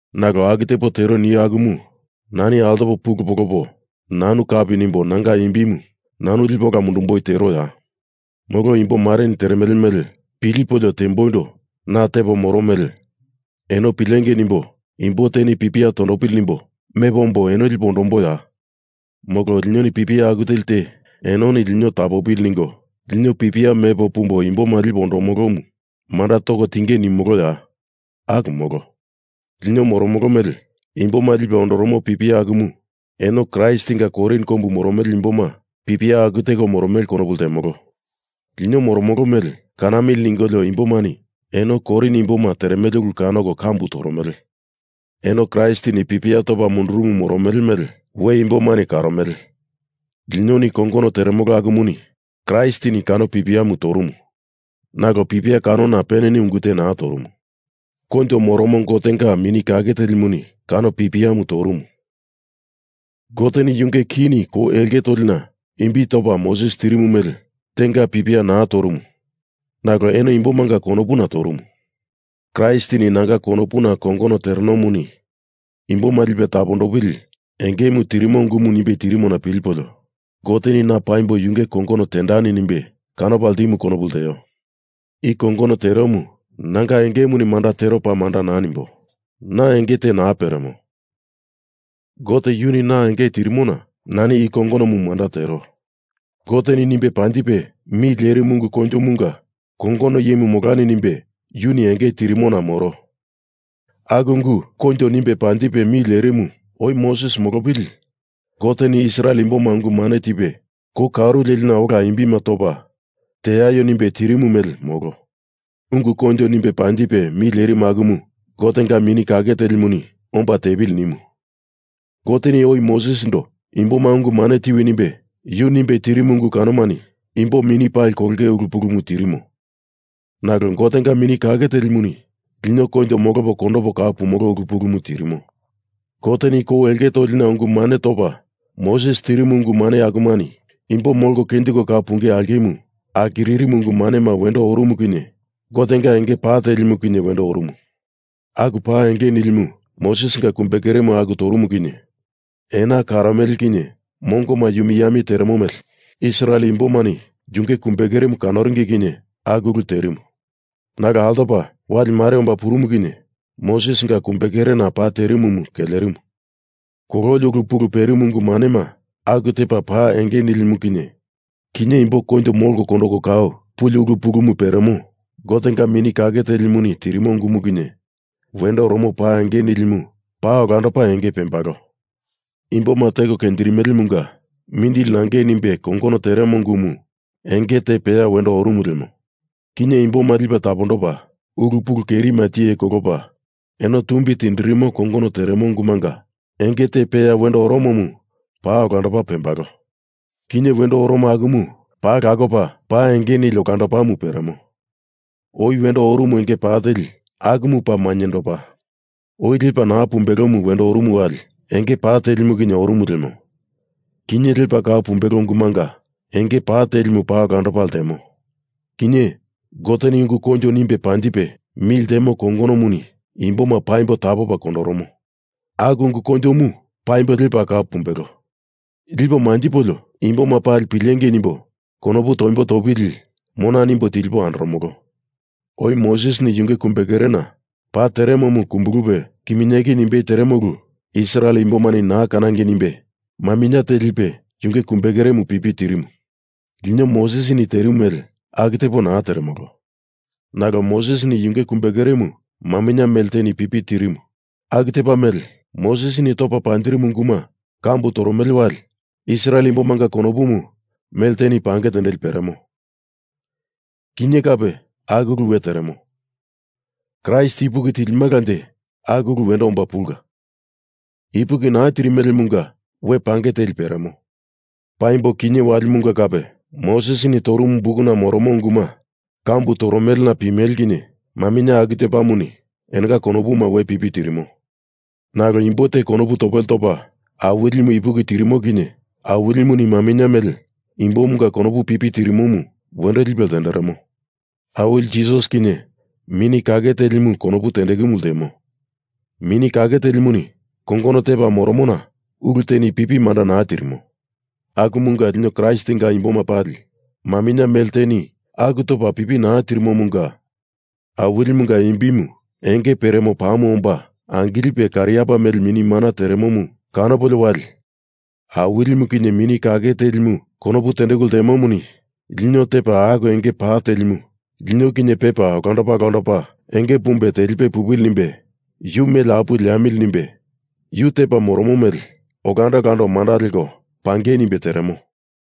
Nalo aku tepo tero nio akumu nani altopo pulu polopo nanu kapi nimbo nanga imbimu nanu lipo ola mundumboi teroya? Molo imbo mareni teremele mele pilipolio temboindo na tepo moro mele eno pilengei nimbo imbo teni pipia tondopili nimbo mepo ombo eno lipo ondomboya? Molo linoni pipia aku teli te enoni lino tapopili ningo lino pipia mepo pumbo imboma lipo ondomolomu manda toko tinge nimoloya? Aku molo. Lino moromolo mele imboma lipe ondoromo pipia akumu eno Kraistinga Korin kombu moromele imboma pipia aku teko moromele konopu ltemolo. Lino moromolo mele kanamili ningolio imbomani eno Korin imboma teremele ulu kanoko kambu toromele. Eno Kraistini pipia topa mundurumu moromele mele we imbomani karomele. Linoni kongono teremolo akumuni Kraistini kano pipiamu torumu. Nalo pipia kanona peneni ungu te naa torumu. Koinjo moromo Gotenga Mini Kake Telimuni kano pipiamu torumu. Goteni yunge kini kou elke tolina imbi topa Moses tirimu mele tenga pipia naa torumu nalo eno imbomanga konopuna torumu. Kraistini nanga konopuna kongono terenomuni imboma lipe tapondoli engemu tirimo ungu nimbe tirimona pilipolio Goteni na paimbo yunge kongono tendani nimbe kanopa ltimumu konopu lteo. I kongono teromu nanga engemuni manda tero paa manda naa nimbo. Na enge te naa peremo. Gote yuni na enge tirimona nani i kongonomu manda tero. Goteni nimbe panjipe mi lerimu ungu koinjomunga kongono iyemu molani nimbe yuni enge tirimona moro. Aku ungu koinjo nimbe panjipe mi lerimumu oi Moses molopili Goteni Israel imboma ungu mane tipe kou karu lelina ola imbima topa teaio nimbe tirimu mele, molo. Ungu koinjo nimbe panjipe mi lierimu akumu Gotenga Mini Kake Telimuni omba tepili nimu. Goteni oi Mosesindo imboma ungu mane tiwi nimbe yu nimbe tirimu ungu kanomani imbo mini pali kolonge ulu pulumu tirimo, nalo Gotenga Mini Kake Telimuni lino koinjo molopo kondopo kau pumolo ulu pulumu tirimo. Goteni kou elke tolina ungu mane topa Moses tirimu ungu mane akumani imbo molko kenjiko kau punge aulkemu akiririmu ungu manema wendo orumu kinye Gotenga enge pa telimu kinye wendo orumu. Aku pa enge nilimu Mosesinga kumbekeremu aku torumu kinye, ena karomele kinye mongoma yumi yami teremo mele Israel imbomani yunge kumbekeremu kanoringi kinye aku ulu terimu. Nalo altopa wali mare omba purumu kinye Mosesinga kumbekerena pa terimumu kelerimu. Kololi ulu pulumu perimu ungu manema aku tepa pa enge nilimu kinye wendo orumu ltemo kinye, imbo koinjo molko kondoko kau puli ulu pulumu peremo Gotenga Mini Kake Telimuni tirimo ungumu kinye wendo oromo pa enge nilimu paa olandopa enge pembalo. Imboma teko kenjirimelemunga mindili nangei nimbe kongono teremo ungumu enge te peya wendo orumu lemo kinye, imboma lipe tapondopa ulu pulu kerima tiye kolopa eno tumbi tindirimo kongono teremo ungumunga enge te peya wendo oromomu paa olandopa pembalo. Kinye wendo oromo akumu paa lakopa pa enge nili olandopamu peremo. Oi wendo orumu enge pa teli akumu paa mainyendopa. Oi lepa naa pumbelomu wendo orumu wali enge pa telimu kinye orumu lemo, kinye lepa kau pumbelo ungumunga enge pa telimu paa olandopa ltemo. Kinye, Goteni ungu koinjo nimbe panjipe mi ltemo kongonomuni imboma paimbo tapopa kondoromo, aku ungu koinjomu paimbo lepa kau pumbelo, lipo manjipolio, imboma pali pilengei nimbo konopu toimbo topili mona nimbo tilipo andoromolo. Oi Mosesini yunge kumbekerena pa teremomu kumbulupe kiminyeki nimbei teremo ulu Israel imbomani naa kanangei nimbe maminye te lipe yunge kumbekeremu pipi tirimu. Lino Mosesini terimu mele aku tepo naa teremolo. Nalo Mosesini yunge kumbekeremu maminye mele teni pipi tirimu, aku tepa mele Mosesini topa panjirimu unguma kambu toromele wali Israel imbomanga konopumu mele teni pange tendeli peremo. Kinye kape aku ulu we teremo. Kraist ipuki tilimalanje aku ulumu wendo omba pulka. Ipuki naa tirimelemunga we pange teli peremo. Paimbo kinye walimunga kape Mosesini torumu bukuna moromo unguma kambu toromelena pimele kinye maminye aku tepamuni enonga konopuma we pipi tirimo. Nalo imbo te konopu topele topa Awilimu ipuki tirimo kinye Awilimuni maminye mele imbomunga konopumu pipi tirimomu wendo lipe ltenderemo. Awili Jisas kinye Mini Kake Telimu konopu tendekumu ltemo. Mini Kake Telimuni kongono tepa moromona ulu teni pipi manda naa tirimo. Akumunga lino Kraistinga imboma pali maminye mele teni aku topa pipi naa tirimomunga, Awilimunga imbimu enge peremo pamu omba angilipe kariapa melena mini mana teremomu kanopolio wali Awilimu kinye Mini Kake Telimu konopu tendeku ltemomuni lino tepa aku enge pa telimu lino kinye pepa olandopa olandopa enge pumbe telipe pupili nimbe yu mele apuwe leamili nimbe yu tepa moromo mele olando olando manda leko pangei nimbe teremo.